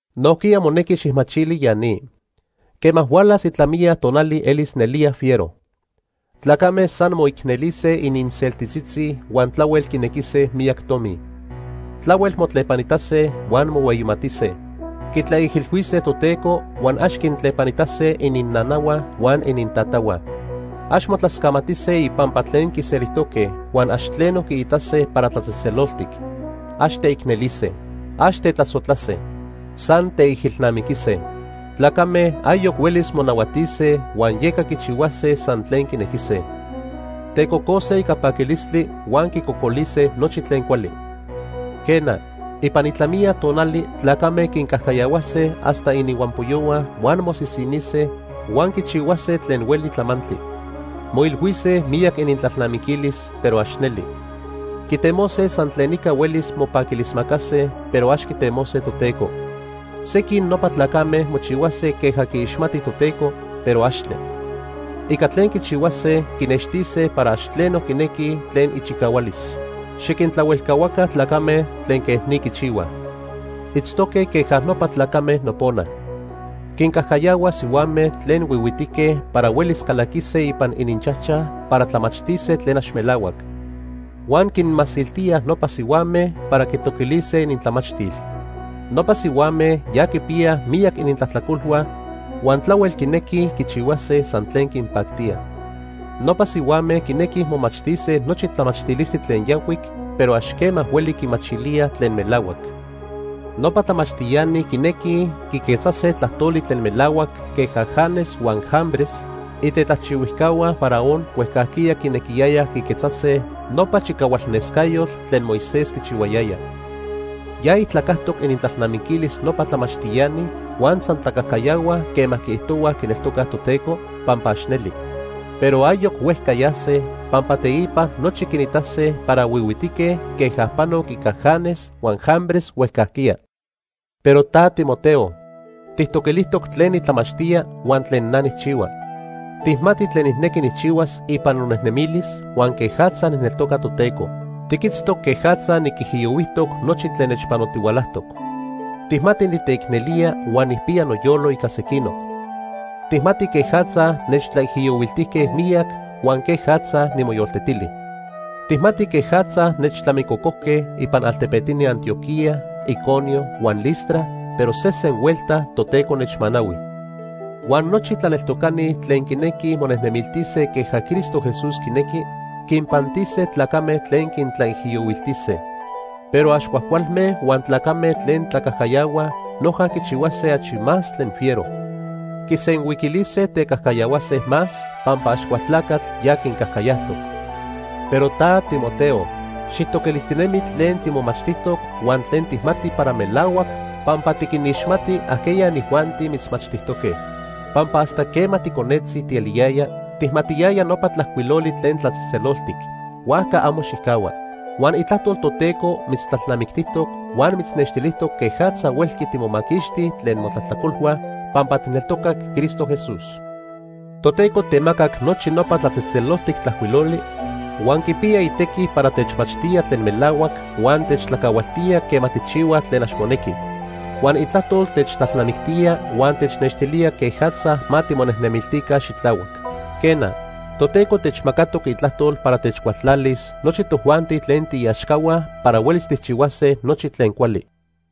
Nojquiya monequi xijmachili ya ni. Quema hualas itlamiya tonali elis nelía fiero. Tlacame san moicnelise ininseltitzitzi huan tlahuel quinequise miyac tomi. Tlahuel motlepanitase huan mohueyimatise. Quitlaijilhuise Toteco huan ax quintlepanitase ininnanahua huan inintatahua. Ax motlascamatise ipampa tlen quiselijtoque huan ax tleno quiitase para tlatzejtzeloltic. Ax teicnelise. Ax tetlasojtlase. San teijilnamiquise. Tlacame ayoc huelis monahuatise huan yeca quichihuase san tlen quinequise. Tecocose ica paquilistli, huan quicocolise nochi tlen cuali. Quena, ipan itlamiya tonali tlacame quincajcayahuase hasta ininhuampoyohua huan mosisinise huan quichihuase tlen hueli tlamantli. Moilhuise miyac inintlalnamiquilis, pero ax neli. Quitemose san tlen ica huelis mopaquilismacase, pero ax quitemose Toteco. Sequin nopa tlacame mochihuase queja quixmatij Toteco, pero axtle. Ica tlen quichihuase quinextise para ax tleno quinequij tlen ichicahualis. Xiquintlahuelcahua tlacame tlen quej ni quichihuaj. Itztoque queja nopa tlacame nopona. Quincajcayahuaj sihuame tlen huihuitique para huelis calaquise ipan ininchajchaj para tlamachtise tlen ax melahuac. Huan quinmasiltíaj nopa sihuame para quitoquilise inintlamachtil. Nopa sihuame ya quipiyaj miyac inintlajtlacolhua huan tlahuel quinequij quichihuase san tlen quinpactía. Nopa sihuame quinequij momachtise nochi tlamachtilistli tlen yancuic, pero ax quema hueli quimachilíaj tlen melahuac. Nopa tlamachtiani quinequij quiquetzase tlajtoli tlen melahuac queja Janes huan Jambres, itetlajchihuijcahua Faraón huejcajquiya quinequiyayaj quiquetzase nopa chicahualnescayotl tlen Moisés quichihuayaya. Ya ijtlacajtoc inintlalnamiquilis nopa tlamachtiani huan san tlacajcayahuaj quema quiijtohuaj quineltocaj Toteco, pampa ax neli. Pero ayoc huejca yase, pampa teipa nochi quinitase para huihuitique queja panoc ica Janes huan Jambres huejcajquiya. Pero ta Timoteo, tijtoquilijtoc tlen nitlamachtía huan tlen na nijchihua. Tijmati tlen nijnequi nijchihuas ipan nonejnemilis huan quejatza nijneltoca Toteco. Tiquitztoc quejatza niquijiyohuijtoc nochi tlen nechpanotihualajtoc. Tijmati niteicnelía huan nijpiya noyolo ica sequinoc. Tijmati quejatza nechtlaijiyohuiltijque miyac huan quejatza nimoyoltetili. Tijmati quejatza nechtlamicocojque ipan altepetini Antioquía, Iconio huan Listra, pero sesen huelta Toteco nechmanahui. Huan nochi tlaneltocani tlen quinequij monejnemiltise queja Cristo Jesús quinequi, quinpantise tlacame tlen quintlaijiyohuiltise. Pero ax cuajcualme huan tlacame tlen tlacajcayahuaj noja quichihuase achi más tlen fiero. Quisenhuiquilise tecajcayahuase más pampa Axcualtlacatl ya quincajcayajtoc. Pero ta, Timoteo, xijtoquilijtinemi tlen timomachtijtoc huan tlen tijmati para melahuac pampa tiquinixmati ajqueya inijuanti mitzmachtijtoque. Pampa hasta quema ticonetzi tieliyaya, tijmatiyaya nopa Tlajcuiloli tlen tlatzejtzeloltic. Huajca amo xijcahua. Huan Itlajtol Toteco mitztlalnamictijtoc huan mitznextilijtoc quejatza huelqui timomaquixti tlen motlajtlacolhua pampa tijneltocac Cristo Jesús. Toteco temacac nochi nopa Tlatzejtzeloltic Tlajcuiloli, huan quipiya itequi para techmachtía tlen melahuac huan techtlacahualtía quema tijchihuaj tlen ax monequi. Huan Itlajtol techtlalnamictía huan technextilía quejatza ma timonejnemiltica xitlahuac. Quena, Toteco techmacatoc Itlajtol para techcualtlalis nochi tojuanti tlen tiiaxcahua para huelis tijchihuase nochi tlen cuali.